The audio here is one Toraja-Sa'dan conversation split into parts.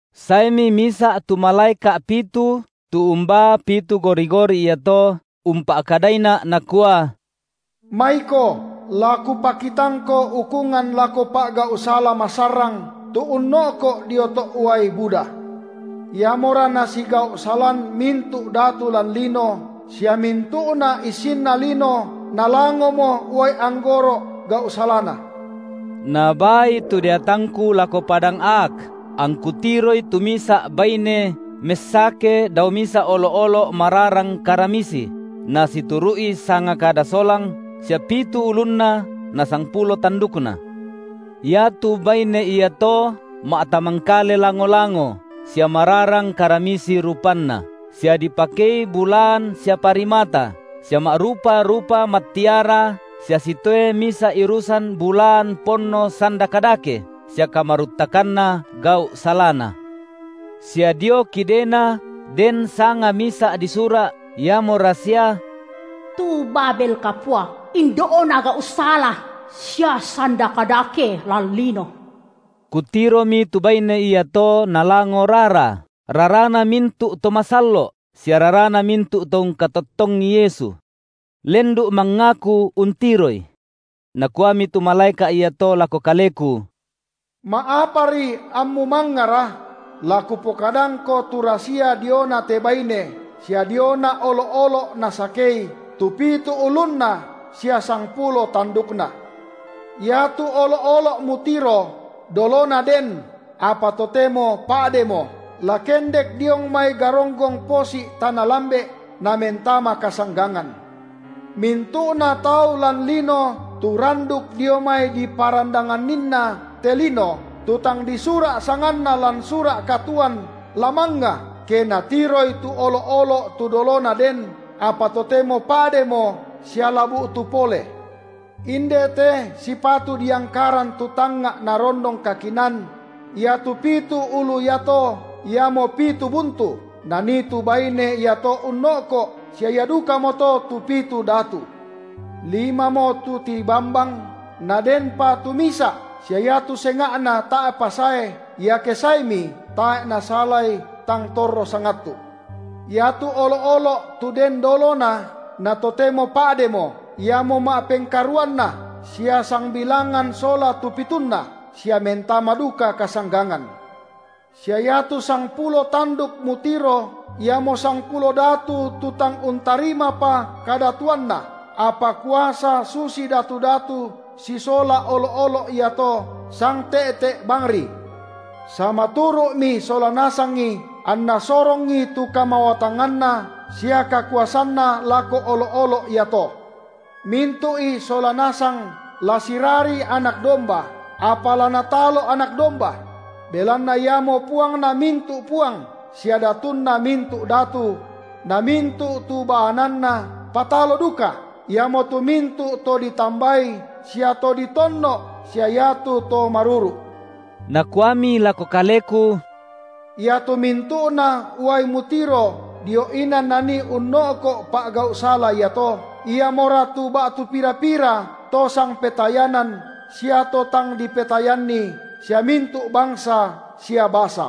Saemi misa’ tu malaeka’ pitu tu umbaa pitu gori-gori iato, umpa’kadaina’ nakua: Maiko la kupakitangko ukungan lako pa’gau’ sala masarrang tu unno’ko’ dio to’ uai buda; iamora nasigau’-salan mintu’ datu lan lino, sia mintu’na issinna lino nalangomo uai anggoro’ gau’ salana. Nabaai tu deatangku lako padang aak, angku tiroi tu misa’ baine messake dao misa’ olo’-olo’ mararang karamisi, nasituru’i sanga kada solang, sia pitu ulunna na sangpulo tandukna. Iatu baine iato ma’tamangkale lango-lango sia mararang karamisi rupanna, sia dipakei bulaan sia parimata, sia ma’rupa-rupa mattiara sia sitoe misa’ irusan bulaan ponno sanda kadake sia kamaruttakanna gau’ salana; sia dio kidena den sanga misa’ disura’, iamo rasia: Tu Babel kapua, indo’na gau’ sala sia sanda kadake lan lino. Kutiromi tu baine iato nalango rara, rarana mintu’ to masallo’ sia rarana mintu’ to ungkatottongI Yesu. Lendu’ mangngaku untiroi. Nakuami tu malaeka’ iato lako kaleku: Ma’apari ammu mangngara? La kupokadangko tu rasia diona te baine, sia diona olo’-olo’ nasakei, tu pitu ulunna sia sangpulo tandukna. Iatu olo’-olo’ mutiro, dolona den apa totemo pa’demo, la kendek diong mai garonggong posi’ tana lambe’, namentama kasanggangan. Mintu’na tau lan lino tu randuk dio mai diparandanganninna te lino tu tang disura’ sanganna lan sura’ katuoan, la mangnga, ke natiroi tu olo’-olo’ tu dolona den, apa totemo pa’demo sia la bu’tu pole. Inde te sipatu diangkaran tu tangnga’ narondong kakinaan; iatu pitu ulu iato, iamo pitu buntu, nanii tu baine iato unno’ko’ sia ia dukamoto tu pitu datu: Limamo tu tibambang, nadenpa tu misa’, sia iatu senga’na tae’pa sae, iake saemi, tae’ nasalai tang torro sangattu’. Iatu olo’-olo’ tu den dolona, na totemo pa’demo, iamo ma’pengkaruanna, sia sangbilangan sola tu pitunna, sia mentama duka kasanggangan. Sia iatu sangpulo tanduk mutiro iamo sangpulo datu tu tang untarimapa kadatuanna, apa kuasa susi datu-datu sisola olo’-olo’ iato sangte’te’ bangri. Samaturu’mi sola nasangi, anna sorongi tu kamawatanganna sia kakuasanna lako olo’-olo’ iato. Mintu’i sola nasang la sirari Anak domba, apa la Natalo Anak domba; belanna Iamo Puangna mintu’ puang sia Datunna mintu’ datu; na mintu’ tu baananna patalo duka, iamotu mintu’ to ditambai sia to ditonno’ sia iatu to maruru’. Nakuami lako kaleku: Iatu mintu’na uai mutiro dio inan nanii unno’ko’ pa’gau’ sala iato, iamora tu ba’tu pira-pira to sangpetayanan sia to tang dipetayanni sia mintu’ bangsa sia basa.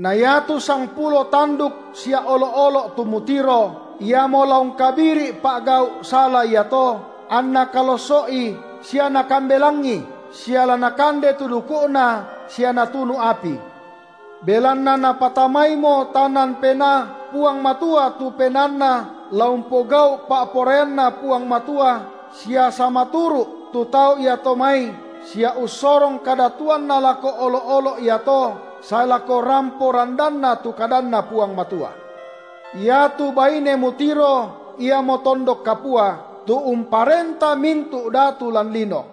Na iatu sangpulo tanduk sia olo’-olo’ tu mutiro, iamo la ungkabiri’ pa’gau’ sala iato anna kalosso’i sia nakambelangi, sia la nakande tu duku’na sia natunu api. Belanna Napatamaimo tanan penaa Puang Matua tu penaanna la umpogau’ pa’poraianNa Puang Matua sia samaturu’ tu tau iato mai sia ussorong kadatuanna lako olo’-olo’ iato sae lako rampo randanna tu kadanNa Puang Matua. Iatu baine mutiro iamo tondok kapua, tu umparenta mintu’ datu lan lino.